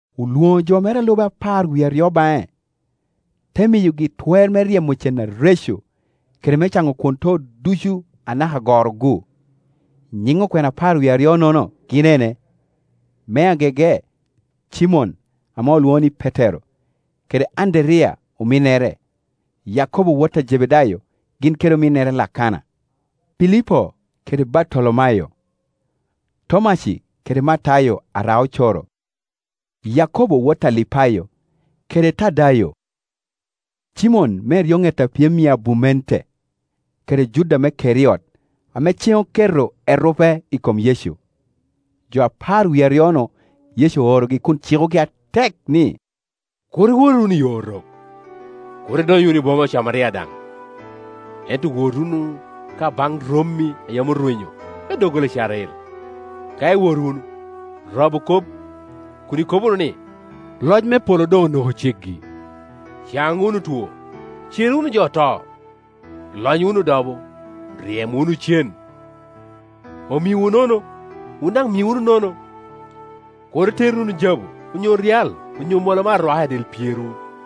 Olwoŋo jo mere a lube apar wie aryo baŋe, te miyogi twer me ryemo cen areco, kede me caŋo kwon too ducu anaka goro-gu. Nyiŋ okwena apar wie aryo-nono gin ene: me agege Cimon, ame alwoŋo ni Petero, kede Anderiya ominnere; Yakobo wot a Jebedayo gin kede ominnere Lakana; Pilipo kede Bartolomayo; Tomaci kede Matayo ara-ocoro; Yakobo wot a Alipayo, kede Tadayo; Cimon me eryoŋet apyem i abumente, kede Juda me Keriot, ame cen oketo erupe i kom Yecu. Jo apar wie aryo-nu Yecu oorogi kun cikogi atek ni, “Kur iwot wunu iyo Orok, kur idony wunu i boma Ocamaria daŋ; ento wot wunu ka baŋ rommi a yam orwenyo me doggola Icrael. Ka iwot wunu, rabu kop kun ikobo wunu ni, ‘Loc me polo doŋ onoko ceggi.’ Caŋ wunu otwo, cer wunu jo oto, lony wunu odobo, ryem wunu cen; omiowu nono, wun daŋ mi wunu nono. Kur iter wunu jabu, onyo ryal onyo mola me arwaka i del pyerwu,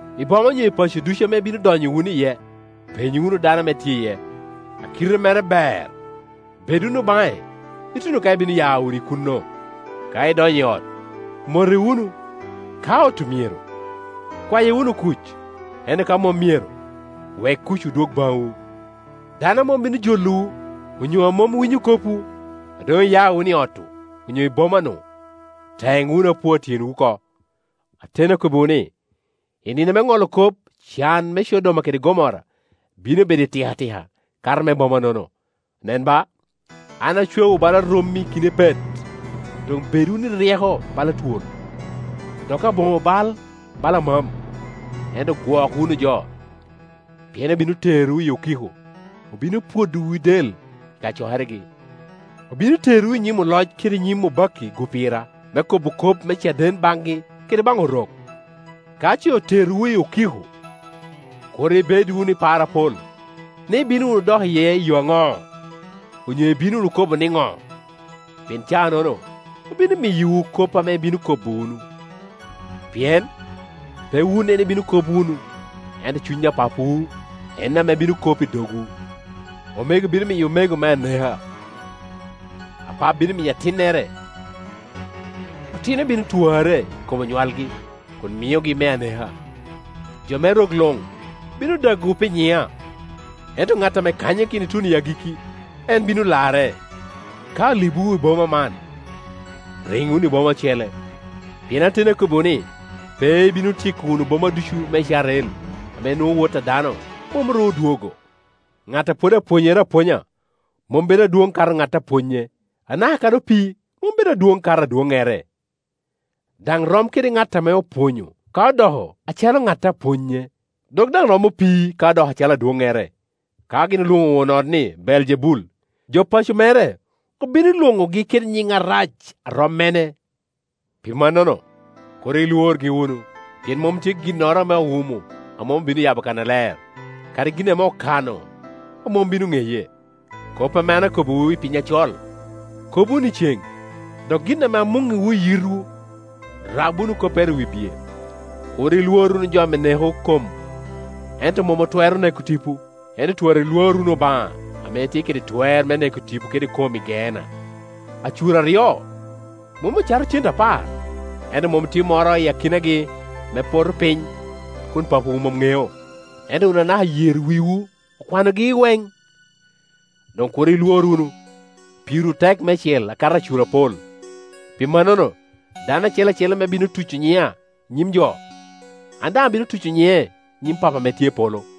I boma onyo i paco ducu ame ibino donyo wunu iye, peny wunu dano a tye iye, a kite mere ber, bed wunu baŋe ituno ka ibino ya wunu i kuno. Ka idonyo i ot, mote wunu. Ka ot-tu myero, kwaye wunu kuc; ento ka mom myero, wek kucwu dwog baŋwu. Dano a mom bino jolowu, onyo a mom winyo kopwu, a doŋ iya wunu i ot-tu onyo i boma-nu, teŋ wunu apua i tyenwu oko. Ateni akobbiwu ni, i nino me ŋolo kop can me Codoma kede Gomora bino bedo itikatika, kato me boma-nono. “Nen ba, an acwaowu bala rommi i kin epet; doŋ bed wunu i ryeko bala twol, dok aboŋo bal bala amam. Ento gwok wunu jo: pien obino terowu i okiko, obino pwodowu i del i kacokeregi, obino terowu i nyim oloc kede i nyim obakki-gu pira, me kobo kop me caden baŋgi kede baŋ Orok. Ka ce oterowu i okiko, kur ibed wunu i par apol, ni, ibino wunu dok iye i yo aŋo, onyo ibino wunu kobo niŋo? Pien caa-nono obino miyowu kop ame ibino kobo wunu; pien pe wun en ibino kop wunu, ento Cuny a Papawu en ame bino kop i dogwu. Omego bino miyo omego me aneka, apap bino miyo atinnere, otino bino twarre i kom onywalgi kun miogi me aneka. Jo me rok luŋ bino dagowu pi nyiŋa. Ento ŋat ame kanyakino ituno i agikki, en bino larre. Ka olibowu i boma man, riŋ wunu i boma ocele; pien ateni akobbiwu ni, pe ibino tyeko wunu boma ducu me i Icarel ame nwoŋo Wot a dano mom ru odwogo. “Ŋat a pwod pwonyere apwonya mom bedo adwoŋ akato ŋat a pwonye, anaka kadi opii mom bedo adwoŋ akato adwoŋŋere; daŋ rom kede ŋat ame opwonyo ka odoko acalo ŋat a pwonye, dok daŋ rom opii ka odoko acalo adwoŋŋere. Ka gin olwoŋo won ot ni Beeljebul, jo paco mere obino lwoŋogi kede nyiŋ arac a rom mene? “Pi mannono, kur ilworgi wunu; pien mom tye ginnoro ame owumo a mom obino yabo kannaler, kadi gin ame okano a mom bino ŋeye. Kop ame an akobbiwu i piny acol, kob wunu i ceŋ; dok gin ame amuŋŋiwu i yitwu, rab wunu koppere i wi biye. Kur ilwor wunu jo ame neko kom ento mom otwero neko tipo; ento twora ilwor wunu Obaŋa ame tye kede twer me neko tipo kede kom i Geena. “Acur aryo mom ocato cente apar? Ento mom tye moro i akinagi ame poto piny a kun Papawu mom ŋeo. Ento wun anaka yer wiwu okwanogi iweŋ. Doŋ kur ilwor wunu; pirwu tek meicel akato acur apol. “Pi mannono, dano acel acel ame bino tuco nyiŋa i nyim jo, an daŋ abino tuco nyiŋe i nyim Pappa ame tye i polo;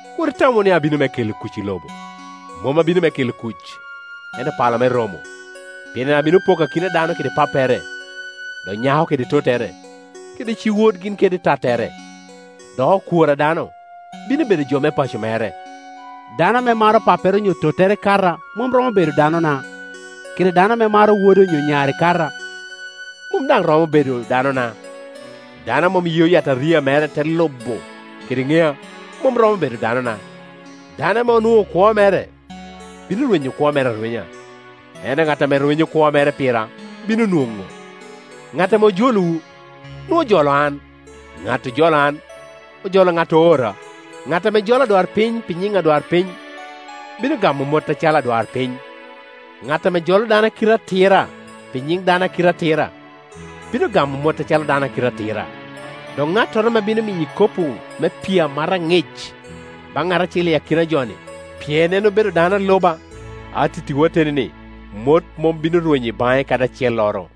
“Kur itam wunu ni abino me kelo kuc i lobo; mom abino me kela kuc, ento pala me romo. Pien an abino poko akina dano kede pappere, dok nyako kede tottere, kede ci-wod gin kede tattere. Dok okwor a dano bino bedo jo me paco mere. Dano ame maro pappere onyo tottere kata mom romo bedo danona; kede dano ame maro wode onyo nyare kata, mom daŋ romo bedo danona. Dano a mom yeo yataria mere, te lubo kede ŋea mom romo bedo danona. Dano ame onwoŋo kwo mere, bino rwenyo kwo mere arwenya; ento ŋat ame rwenyo kwo mere pira, bino nwoŋo. “Ŋat ame jolowu, nwoŋo ojolo an; ŋat a jolo an, ojolo ŋat ame oora. Ŋat ame jolo adwarpiny pi nyiŋ adwarpiny, bino gamo mot acalo adwarpiny; ŋat ame jolo dano a kite atira pi nyiŋ dano a ki te atira, bino gamo mot acalo dano a kite atira. Dok ŋattoro ame bino miyo ikopo me pii amata aŋic baŋ ŋat acel i akina jo-ni, pien en obedo dano a luba, atittiwu ateni ni, mot mom bino rwenyo i baŋe kadi acelloro.”